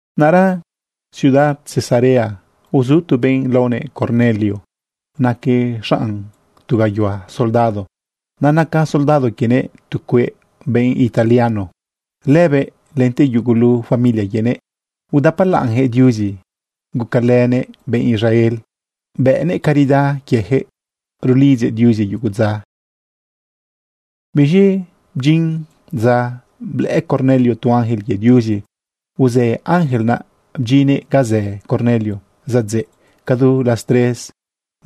Naꞌra ciudad Cesarea uzu tu benꞌ laonëꞌ Cornelio. Naquëꞌ xanꞌ tu gayuhua soldado. Naꞌ naca soldado quienëꞌ tu cueꞌ benꞌ italiano. Lëbëꞌ lente yugulu familia quienëꞌ udapalaꞌnyaquëꞌ Diuzi. Gucalënëꞌ benꞌ Israel, bëꞌnëꞌ caridad quiejëꞌ, rulidzëꞌ Diuzi yugu dza. Biz̃i bdyin dza blëꞌë Cornelio tu ángel quie Diuzi. Uzë ángel naꞌ bdyinnëꞌ ga zë Cornelio. Zadzeꞌ cadu las tres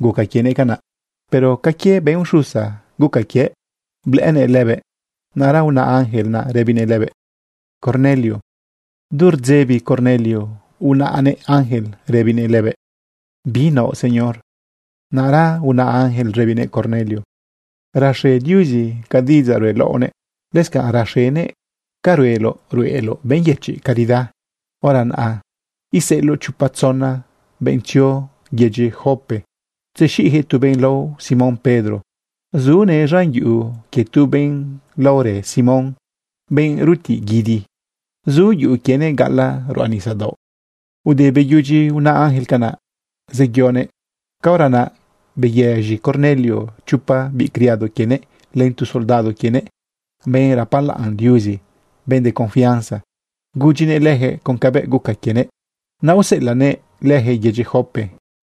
guca quienëꞌ canaꞌ. Pero ca quie benꞌ uxusa guca quiëꞌ blëꞌënëꞌ lëbëꞌ. Naꞌra una ángel naꞌ rëbinëꞌ lëbëꞌ: ―Cornelio. Du rdzebi Cornelio unaꞌnëꞌ ángel rëbinëꞌ lëbëꞌ: ―¿Bi naoꞌ, Señor? Naꞌra una ángel rëbinëꞌ Cornelio: ―Raxe Diuzi ca diꞌidzaꞌ ruꞌeloꞌnëꞌ, lëscanꞌ raxenëꞌ ca rueloꞌ ruꞌeloꞌ benꞌ yëchiꞌ caridad. Hora naꞌ iseꞌeloꞌ chopa tzona benꞌ tzio yedyi Jope tzexiꞌyaquëꞌ tu benꞌ lao Simón Pedro. Zunëꞌ z̃an yuꞌu quie tu benꞌ laorë Simón, benꞌ rutiꞌ guidi. Zu yuꞌu quienëꞌ gaꞌalaꞌ ruꞌa nisadaoꞌ. Ude beyudyi una ángel canaꞌ, zeyonëꞌ. Caora naꞌ beyëz̃i Cornelio chopa biꞌ criado quienëꞌ len tu soldado quienëꞌ, benꞌ rapalaꞌn Diuzi, benꞌ de confianza, gudyinëꞌ leyaquëꞌ con cabëꞌ guca quienëꞌ, naꞌ useꞌelaꞌnëꞌ leyaquëꞌ yedyi Jope.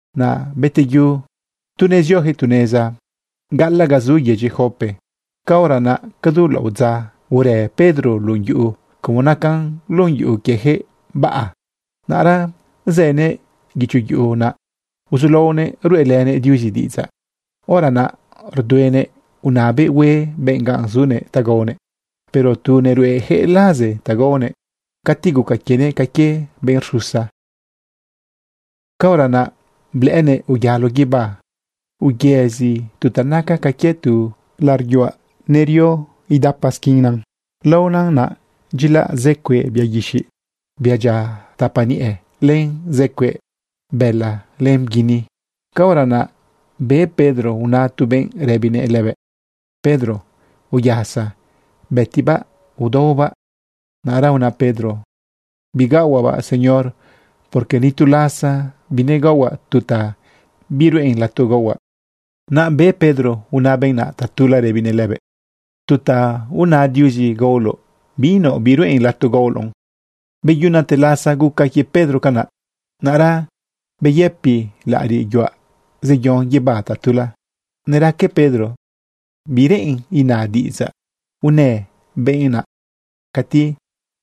Naꞌ beteyu, tu nezioyaquëꞌ tu neza gaꞌalaꞌ ga zu yedyi Jope, caora naꞌ cadu laꞌodza urë Pedro lun yuꞌu, como naca lun yuꞌu quiejëꞌ baꞌa. Naꞌra zënëꞌ guicho yuꞌu naꞌ uzulaonëꞌ ruꞌelënëꞌ Diuzi diꞌidzaꞌ. Hora naꞌ rduenëꞌ unabëꞌ hue benꞌ ga zunëꞌ ta gaonëꞌ. Pero tu neruꞌeyaquëꞌ laze ta gaonëꞌ, cati guca quienëꞌ ca quie benꞌ rxusa. Caora naꞌ blëꞌënëꞌ uyalo guibá, uyëzi tu ta naca ca quie tu laꞌariꞌ yuaꞌ nerio idapa isquinan. Laona naꞌ dyilaꞌ zë cueꞌ bia guixiꞌ, bia dyia tapa niꞌe, len zë cueꞌ bëla len bguini. Caora naꞌ be Pedro una tu benꞌ rëbinëꞌ lëbëꞌ: ―Pedro, uyasa. Bëtibaꞌ, udaobaꞌ. Naꞌra una Pedro: ―Bigaohuaꞌbaꞌ, Señor, porque ni tu lasa binegaohuaꞌ tu ta biruꞌen lato gaohuaꞌ. Naꞌ be Pedro una benꞌ naꞌ tatula rëbinëꞌ lëbëꞌ: ―Tu ta aona Diuzi gaoloꞌ, binaoꞌ biruꞌen lato gaoloꞌn. Beyunate lasa guca quie Pedro canaꞌ, naꞌra beyëpi laꞌariꞌ yuaꞌ zeyon guibá tatula. Neraque Pedro bi reꞌen inë diꞌidzaꞌ unë benꞌ naꞌ cati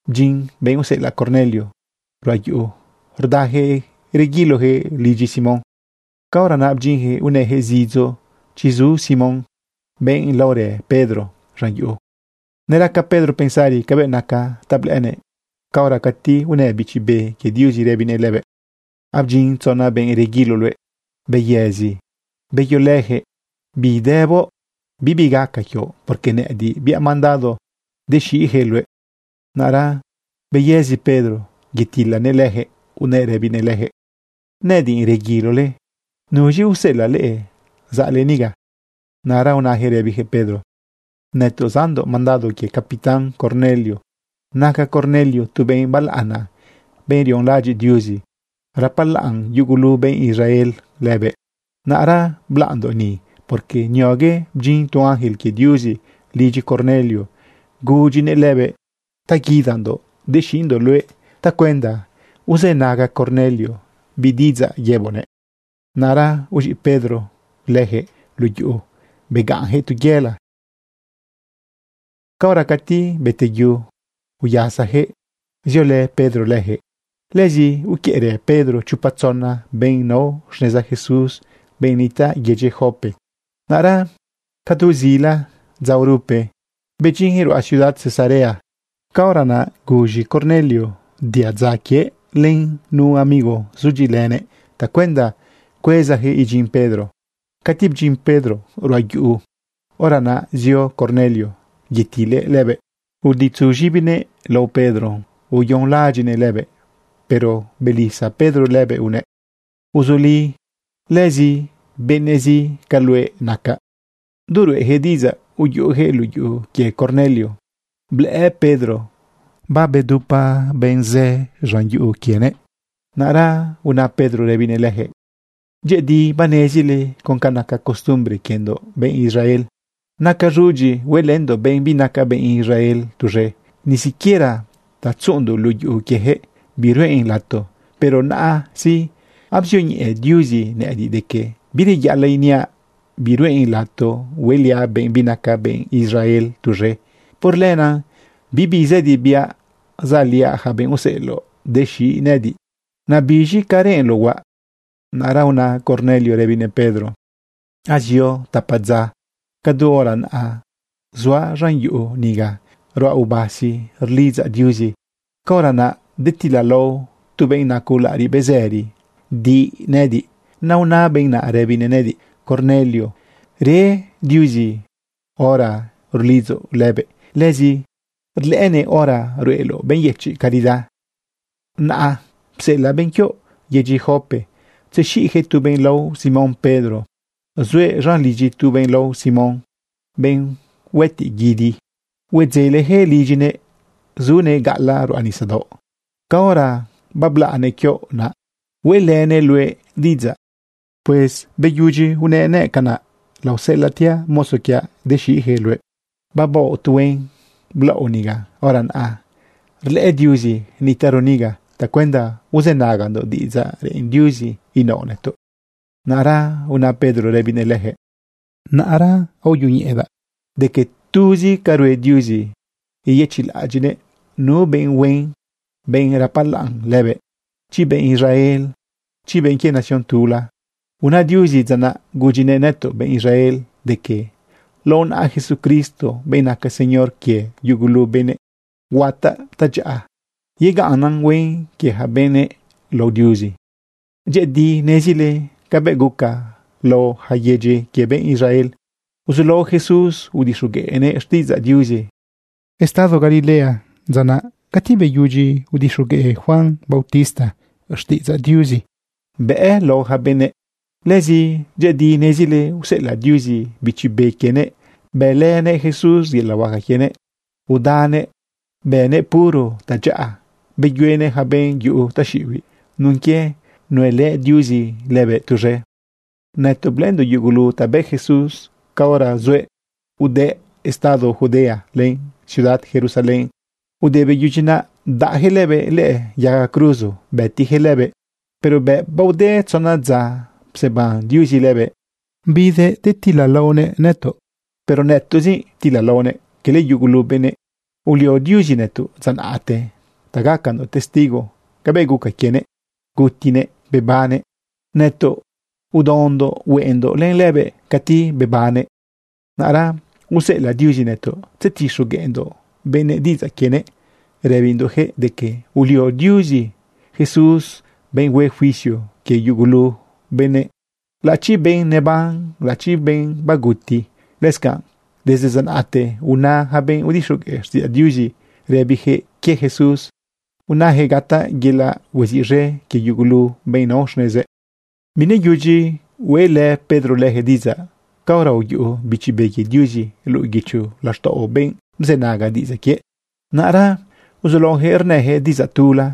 bdyin benꞌ useꞌelaꞌ Cornelio ruꞌa yuꞌu. Rdayaquëꞌ reguiloyaquëꞌ lidyi Simón. Caora naꞌ bdyinyaquëꞌ unayaquëꞌ zidzo chi zu Simón, benꞌ laorë Pedro, z̃an yuꞌu. Neraca Pedro pensari cabëꞌ naca ta blëꞌënëꞌ, caora cati unë Bichi Be quie Diuzi rëbinëꞌ lëbëꞌ: ―Abdyin tzona benꞌ reguilo luëꞌ. Beyëzi, beyolëyaquëꞌ. Bidëboꞌ bibi gaca quioꞌ, porque nëꞌëdiꞌ biaꞌ mandado dexiꞌyaquëꞌ luëꞌ. Naꞌra beyëzi Pedro yetilanëꞌ leyaquëꞌ unëꞌ rëbinëꞌ leyaquëꞌ: ―Nëꞌëdiꞌ reguilole. ¿Nuz̃i useꞌelaꞌ leꞌe zaꞌle niga? Naꞌra unayaquëꞌ rëbiyaquëꞌ Pedro: ―Nëtoꞌ zaꞌndoꞌ mandado quie capitán Cornelio. Naca Cornelio tu benꞌ balaꞌana, benꞌ rionlaꞌadyiꞌ Diuzi. Rapalaꞌn yugulu benꞌ Israel lëbëꞌ. Naꞌra blaꞌndoꞌ ni, porque niogue bdyin tu ángel quie Diuzi lidyi Cornelio gudyinëꞌ lëbëꞌ ta guidandoꞌ dexiꞌndoꞌ luëꞌ tacuenda uzënaga Cornelio bi diꞌidzaꞌ yëboꞌnëꞌ. Naꞌra uz̃iꞌ Pedro leyaquëꞌ luꞌu yuꞌu begaꞌnyaquëꞌ tu yela. Caora cati beteyu, uyasayaquëꞌ ziolë Pedro leyaquëꞌ. Lëzi uquiëꞌrë Pedro chopa tzona benꞌ nao xneza Jesús, benꞌ nitaꞌ yedyi Jope. Naꞌra cadu zila dza urupe bedyinyaquëꞌ ruꞌa ciudad Cesarea. Caora naꞌ guz̃i Cornelio diadza quiëꞌ len nu amigo zudyiꞌilënëꞌ tacuenda cuezayaquëꞌ idyin Pedro. Cati bdyin Pedro ruꞌa yuꞌu, hora naꞌ zio Cornelio yetilëꞌ lëbëꞌ, uditzu z̃ibinëꞌ lao Pedro, uyonlaꞌadyiꞌnëꞌ lëbëꞌ. Pero belisa Pedro lëbëꞌ unëꞌ: ―Uzuli, lëzi benëꞌzi ca luëꞌ nacaꞌ. Du ruꞌeyaquëꞌ diꞌidzaꞌ, uyuꞌuyaquëꞌ luꞌu yuꞌu quie Cornelio, blëꞌë Pedro babedupa benꞌ zë luꞌu lidyinëꞌ. Naꞌra una Pedro rëbinëꞌ leyaquëꞌ: ―Dyëꞌëdi banezile con ca naca costumbre quiendoꞌ benꞌ Israel. Nacan z̃udyi huelëndoꞌ benꞌ binaca benꞌ Israel tuz̃e. Ni siquiera ta tzuꞌundoꞌ luꞌu yuꞌu quieyaquëꞌ biruꞌen lato. Pero naꞌa sí, abzioñeꞌe Diuzi nëꞌëdiꞌ de que bireyaꞌalaꞌ iniaꞌ biruꞌen lato hueliaꞌ benꞌ binaca benꞌ Israel tuz̃e. Por lenaꞌ bibi zëdi biaꞌ zaꞌliaꞌ yaca benꞌ useꞌeloꞌ dexiꞌ nëꞌëdiꞌ. Naꞌ biz̃i, ¿ca reꞌenloꞌ huaꞌ? Naꞌra una Cornelio rëbinëꞌ Pedro: ―Azio tapa dza naꞌ, cadu hora naꞌa, zuaꞌ z̃an yuꞌu niga ruaꞌ ubasi rulidzaꞌ Diuzi. Caora naꞌ detilalao tu benꞌ naco laꞌariꞌ bezëri di nëꞌëdiꞌ. Naꞌ una benꞌ naꞌ rëbinëꞌ nëꞌëdiꞌ: “Cornelio, re Diuzi hora rulidzoꞌ lëbëꞌ. Lëzi rlëꞌënëꞌ hora ruꞌeloꞌ benꞌ yëchiꞌ caridad. Naꞌ pseꞌelaꞌ benꞌ quioꞌ yedyi Jope tzexiꞌyaquëꞌ tu benꞌ lao Simón Pedro. Zuëꞌ z̃an lidyi itu benꞌ lao Simón, benꞌ huëtiꞌ guidi. Huedzelejëꞌ lidyinëꞌ zunëꞌ gaꞌalaꞌ ruꞌa nisadaoꞌ. Caora bablaꞌnëꞌ quioꞌ naꞌ, hueꞌlënëꞌ luëꞌ diꞌidzaꞌ.” Pues beyudyi unëꞌ canaꞌ, laoseꞌelaꞌtiaꞌ mozo quiaꞌ dexiꞌyaquëꞌ luëꞌ. Babaoꞌ tu huen blaoꞌ niga. Hora naꞌ rlëꞌë Diuzi nitaꞌro niga tacuenda uzënagandoꞌ diꞌidzaꞌ reꞌen Diuzi inaoꞌ nëtoꞌ. Naꞌra una Pedro rëbinëꞌ leyaquëꞌ: ―Hora sí, aoyoñeꞌedaꞌ de que tuzi ca rue Diuzi yeyëchiꞌlaꞌadyiꞌnëꞌ nu benꞌ huen, benꞌ rapalaꞌn lëbëꞌ, chi benꞌ Israel, chi benꞌ quie nación tula. Una Diuzi dza naꞌ gudyinëꞌ nëtoꞌ benꞌ Israel de que lao naꞌa Jesucristo, benꞌ naca Señor quie yugulu benëꞌ, huataꞌ tadyaꞌa yegaꞌnnan huen quie yaca benëꞌ lao Diuzi. Dyëꞌëdi nezile cabëꞌ guca lao yaca yedyi quie benꞌ Israel. Uzulao Jesús udixogueꞌnëꞌ xtiꞌidzaꞌ Diuzi estado Galilea dza naꞌ cati beyudyi udixogueꞌ Juan bautista xtiꞌidzaꞌ Diuzi bëꞌ lao yaca benëꞌ. Lëzi dyëꞌëdi nezile useꞌelaꞌ Diuzi Bichi Be quienëꞌ bëlënëꞌ Jesús yelaꞌ huaca quienëꞌ, udanëꞌ bënëꞌ puro tadyaꞌa, beyuenëꞌ yaca benꞌ yuꞌu taxiꞌibiꞌ nun quie nuelë Diuzi lëbëꞌ tuz̃e. Nëtoꞌ blëꞌëndoꞌ yugulu ta bë Jesús caora zuëꞌ udëꞌ estado Judea len ciudad Jerusalén. Ude beyudyi naꞌ bdaꞌyaquëꞌ lëbëꞌ lëꞌë yaga cruzo bëtiyaquëꞌ lëbëꞌ. Pero bëꞌ baode tzona dza pseban Diuzi lëbëꞌ bidëꞌ detilalaonëꞌ nëtoꞌ. Pero nëtoꞌzi ptilalaonëꞌ, quele yugulu benëꞌ. Ulio Diuzi nëtoꞌ dza naꞌte ta gacandoꞌ testigo cabëꞌ guca quienëꞌ gutinëꞌ bebannëꞌ. Nëtoꞌ udaondoꞌ hueꞌendoꞌ len lëbëꞌ cati bebannëꞌ. Naꞌra useꞌelaꞌ Diuzi nëtoꞌ tzetixogueꞌndoꞌ benëꞌ diꞌidzaꞌ quienëꞌ rëbindoꞌyaquëꞌ de que ulio Diuzi Jesús benꞌ hue juicio quie yugulu benëꞌ, laꞌachi benꞌ neban, laꞌachi benꞌ baguti. Lëscanꞌ desde dza naꞌte una yaca benꞌ udixogueꞌ xtiꞌidzaꞌ Diuzi rëbiyaquëꞌ quie Jesús, unayaquëꞌ gataꞌ yelaꞌ hueziꞌz̃e quie yugulu benꞌ nao xnezëꞌ. Bineyudyi hueꞌlë Pedro lejëꞌ diꞌidzaꞌ caora uyuꞌu Bichi Be quie Diuzi luꞌu guicho laxtaꞌo benꞌ bzënaga diꞌidzaꞌ quiëꞌ. Naꞌra uzulaoyaquëꞌ rnëyaquëꞌ diꞌidzaꞌ tula,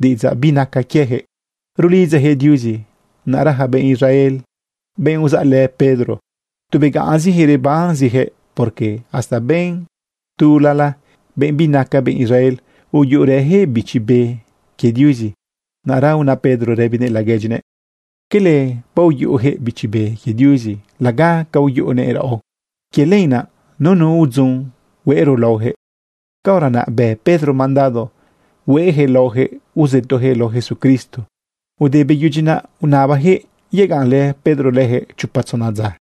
diꞌidzaꞌ binaca quieyaquëꞌ, rulidzayaquëꞌ Diuzi. Naꞌra yaca benꞌ Israel, benꞌ uzaꞌlë Pedro, tu begaꞌnzijëꞌ rebanziyaquëꞌ porque hasta benꞌ tulala, benꞌ binaca benꞌ Israel, uyuꞌurëyaquëꞌ Bichi Be quie Diuzi. Naꞌra una Pedro rëbinëꞌ laguedyinëꞌ: ―¿Quele baoyuꞌuyaquëꞌ Bichi Be quie Diuzi laga ca uyuꞌunëꞌ raꞌo? Quie lenaꞌ nunu udzon hueꞌro laoyaquëꞌ. Caora naꞌ bë Pedro mandado hueꞌyaquëꞌ laoyaquëꞌ uzëtoyaquëꞌ lao Jesucristo. Ude beyudyi naꞌ unabayaquëꞌ yegaꞌnlë Pedro leyaquëꞌ chopa tzona dza.